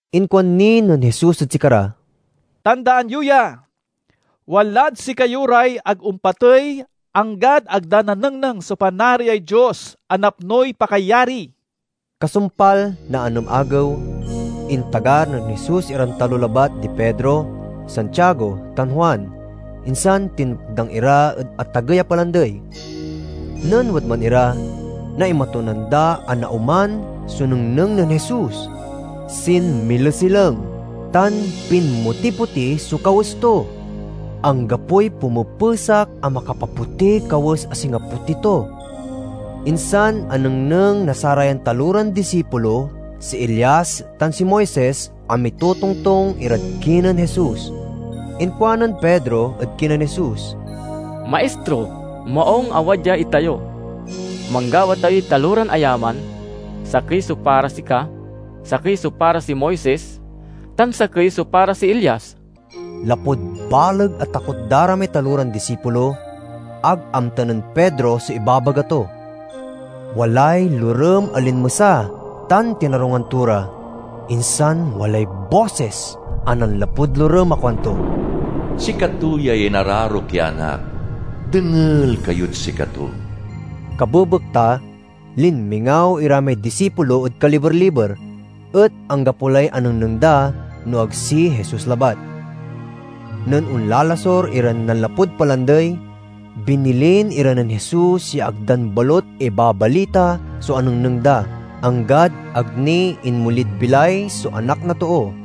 Inkuan ni nen Jesus ed sikara, "Tandaan yo ya! Walad sikayo ray ag ompatey anggad ag da nanengneng so Panariay Dios a napnoy pakayari." Kasumpal na anem agew, intagar nen Jesus iran talo labat di Pedro, Santiago, tan Juan, insan tinmakdang ira ed atagey a palandey. Nen wadman ira, naimatunan da a naoman so nengneng nen Jesus. Sinmilesileng tan pinmotipoti so kawes to; anggapoy pumepesak a makapapotiy kawes a singa poti to. Insan anengneng na sarayan taloran disipulo si Elias tan si Moises a mitotongtong irad kinen Jesus. Inkuanen Pedro ed kinen Jesus, "Maistro, maung a wadya itayo. Manggawa tayoy taloran ayaman: sakey so para sika, sakey so para si Moises, tan sakey so para si Elias." Lapud baleg a takot da ra may taloran disipulo, ag amta nen Pedro so ibabaga to. Walay lorem a linmesa tan tinarungan to ra. Insan walay bosis a nanlapud lorem a kuanto, "Sikato yay inararok ya Anak—dengel kayod sikato!" Kabebekta linmingaw ira may disipulo ed kaliber-liber, et anggapo lay anengneng da no ag si Jesus labat. Nen onlalasur iran nanlapud palandey, binilin ira nen Jesus ya ag dan balut ibabalita so anengneng da, anggad ag ni inmolid bilay so Anak na Too.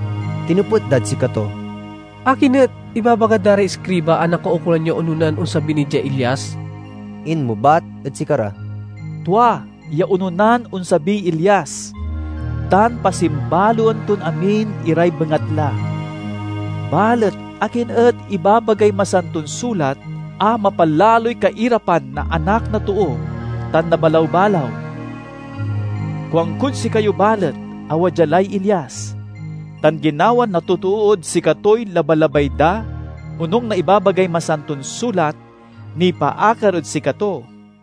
Tinepet dad sikato, "Akin et ibabaga da ray iskriba a nakaukolan ya ononan onsabi ni diay Elias?" Inmebat ed sikara, "Tua ya ononan onsabiy Elias tan pasimbaloen ton amin iray bengatla. Balet akin et ibabagay Masanton Sulat a mapalaloy kairapan na Anak na Too tan nabalaw-balaw? Kuankod sikayo balet a wadya lay Elias, tan ginawa na totood sikatoy labalabay da onung na ibabagay Masanton Sulat nipaakar ed sikato."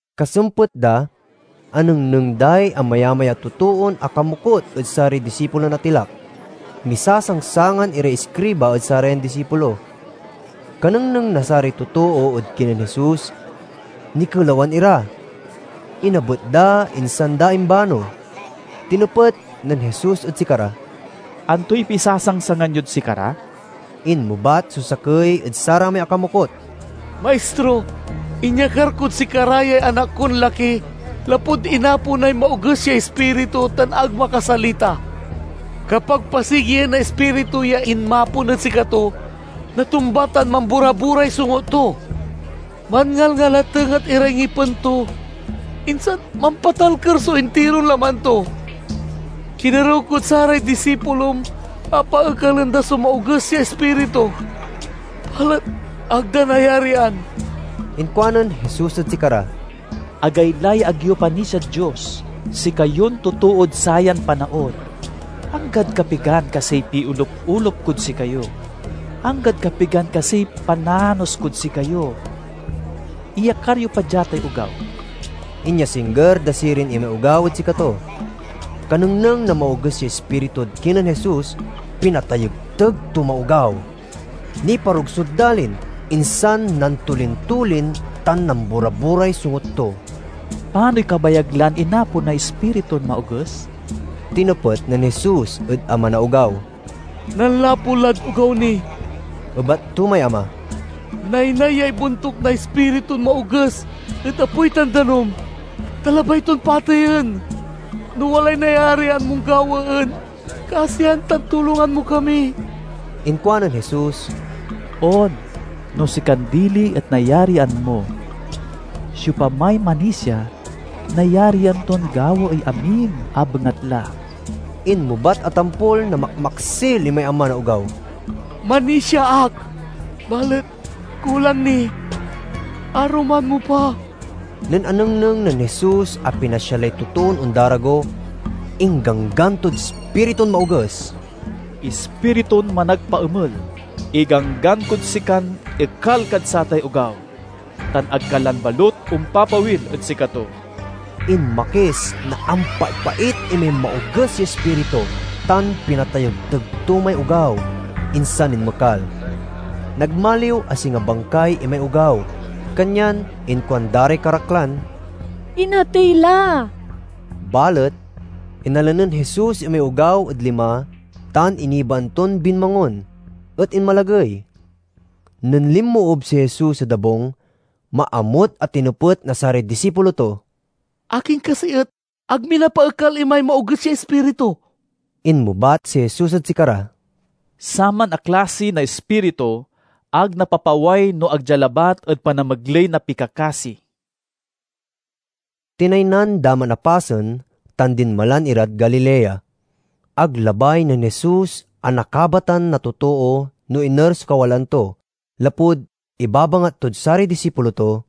Kasempet da, anengneng day amayamay a totoon akamokut ed saray disipulon atilak. Misasangsangan iray iskriba ed sarayan disipulo. Kanengneng na saray totoo ed kinen Jesus, nikelawan ira. Inabet da, insan da imbano. Tinepet nen Jesus ed sikara, "Antoy pisasangsangan yod sikara?" Inmebat so sakey ed saramay akamokut, "Maistro, inyakar kod sikara yay anak kon laki lapud inaponay maoges ya ispiritu tan ag makasalita. Kapag pasigien na ispiritu ya inmapon ed sikato, natumba tan mamboraboray songut to. Manngalngalatenget iray ngipen to, insan mampatalker so intiron laman to. Kinerew kod saray disipulom a paekalen da so maoges ya ispiritu balet ag da nayarian." Inkuanen Jesus ed sikara, "Agaylay ag yo panisiad Dios, sikayon totood sayan panaon! Anggad kapigan kasiy piolup-olup kod sikayo? Anggad kapigan kasiy pananos kod sikayo? Iyakar yo pa dia tay ogaw." Inyasingger da sirin imay ogaw ed sikato. Kanengneng na maoges ya ispiritud kinen Jesus, pinatayegteg to may ogaw. Niparugsod dalin, insan nantolin-tolin tan nambora–boray songut to. "Panoy kabayag lan inaponay ispiritun maoges?" tinepet nen Jesus ed ama na ogaw. "Nanlapu lad ogaw ni," ebat to may ama. "Naynay ya ibontuk na ispiritun maoges ed apoy tan danum, ta labay ton pateyen. No walay nayarian mon gawaen, kasian tan tulongan mo kami!" Inkuanen Jesus, "On, no sikan dili et nayarian mo! Siopamay manisia, nayarian ton gawaey amin a bengatla." Inmebat a tampol na makmaksil imay ama na ogaw, "Manisia ak, balet kulang ni. Aruman mo pa!" Nen anengneng nen Jesus a pinasia lay totoon ondarago, ingganggan tod ispiritun maoges, "Ispiritun managpaemel, iganggan kod sikan ekal kad satay ogaw, tan ag ka lan balut ompapawil ed sikato!" Inmakis na ampaipait imay maoges ya ispiritu, tan pinatayegteg to may ogaw, insan inmekal. Nagmaliw a singa bangkay imay ogaw, kanyan inkuan da ray karaklan, "Inatey la!" Balet inala nen Jesus imay ogaw ed lima tan inibaan ton binmangon, et inmalagey. Nen linmoob si Jesus ed abung, maamut a tinepet na saray disipulo to, "Akin kasi et ag mi napaekal imay maoges ya ispiritu?" Inmebat si Jesus ed sikara, "Saman a klasi na ispiritu, ag napapaway no ag dia labat ed panamegley na pikakasi." Tinaynan da man a pasen tan dinmalan irad Galilea. Ag labay nen Jesus a nakabatan na totoo no iner so kawalaan to, lapud ibabangat tod saray disipulo to,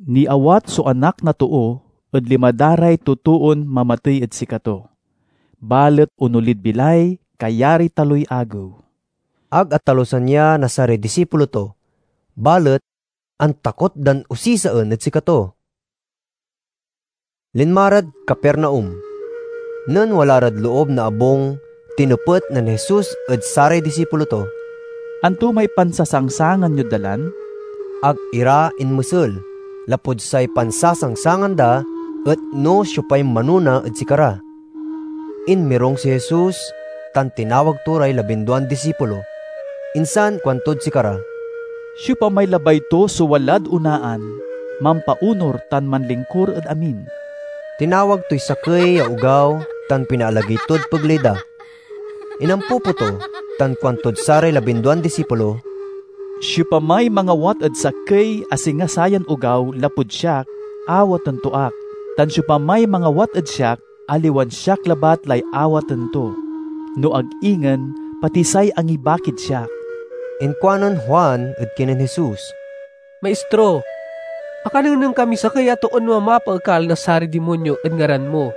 "Niawat so Anak na Too ed lima da ray totoon mamatey ed sikato, balet onolid bilay kayariy taloy agew." Ag atalusan ya na saray disipulo to, balet antakot dan osisaen ed sikato. Linma rad Capernaum. Nen wala rad loob na abung tinepet nen Jesus ed saray disipulo to, "Anto may pansasangsangan yod dalan?" Ag ira inmesel, lapud say pansasangsangan da et no siopay manona ed sikara. Inmirung si Jesus tan tinawag to ray labinduan disipulo, insan kuantod sikara, "Siopamay labay to so walad onaan, mampaonur tan manlingkur ed amin." Tinawag toy sakey ya ogaw tan pinaalagey tod pegley da. Inampupo to tan kuantod saray labinduan disipulo, "Siopamay mangawat ed sakey a singa sayan ogaw lapud siak awaten to ak; tan siopamay mangawat ed siak, aliwan siak labat lay awaten to, no ag ingen pati say angibakid siak." Inkuanen Juan ed kinen Jesus, "Maistro, akanengneng kamiy sakey a toon mamapaekal na saray dimonyo ed ngaran mo.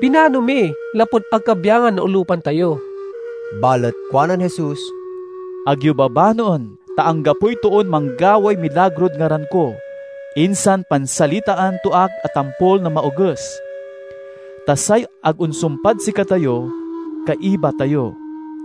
Binano mi, lapud ag kabyangan na olupan tayo." Balet kuanen Jesus, "Ag yo babanoen, ta anggapoy toon manggaway milagrod ngaran ko, insan pansalitaan to ak a tampol na maoges. Ta say ag onsumpad sikatayo, kaiba tayo.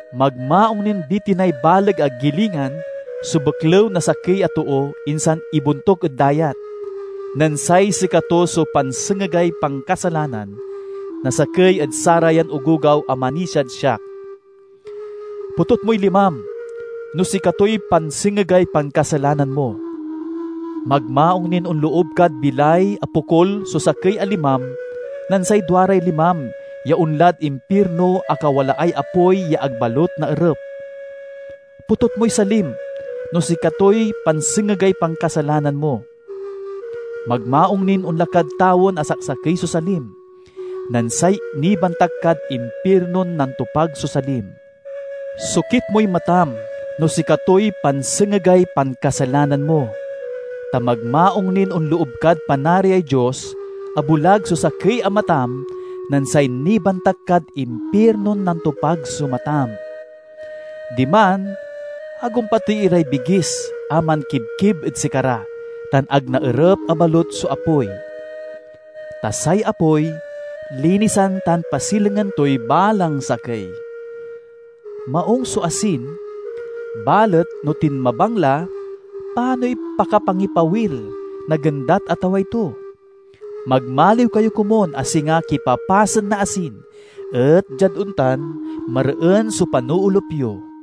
"Magmaung nin bitinay baleg a gilingan so beklew na sakey a too insan ibontuk ed dayat, nen say sikato so pansengegay pankasalanan na sakey ed sarayan ogogaw a manisiad siak. Potut moy limam no sikatoy pansengegay pankasalanan mo. Magmaung nin onloob kad bilay a pokul so sakey a limam nen say duaray limam ya onlad impirno a kawalaay apoy ya ag balut naerep. Potut moy salim no sikatoy pansengegay pankasalanan mo. Magmaung nin onla kad tawen a saksakey so salim, nen say nibantak kad impirnon nantopag so salim. Sokit moy matam no sikatoy pansengegay pankasalanan mo, ta magmaung nin onloob kad Panariay Dios a bulag so sakey a matam nen say nibantak kad impirnon nantopag so matam. Diman, 'ag ompatey iray bigis a mankibkib ed sikara, tan ag naerep a balut so apoy.' "Ta say apoy linisan tan pasilengen toy balang sakey. Maung so asin, balet no tinmabang la, panoy pakapangipawil na gendat a taway to? Magmaliw kayo komun a singa kipapasen na asin et, diad ontan, mareen so panoolup yo."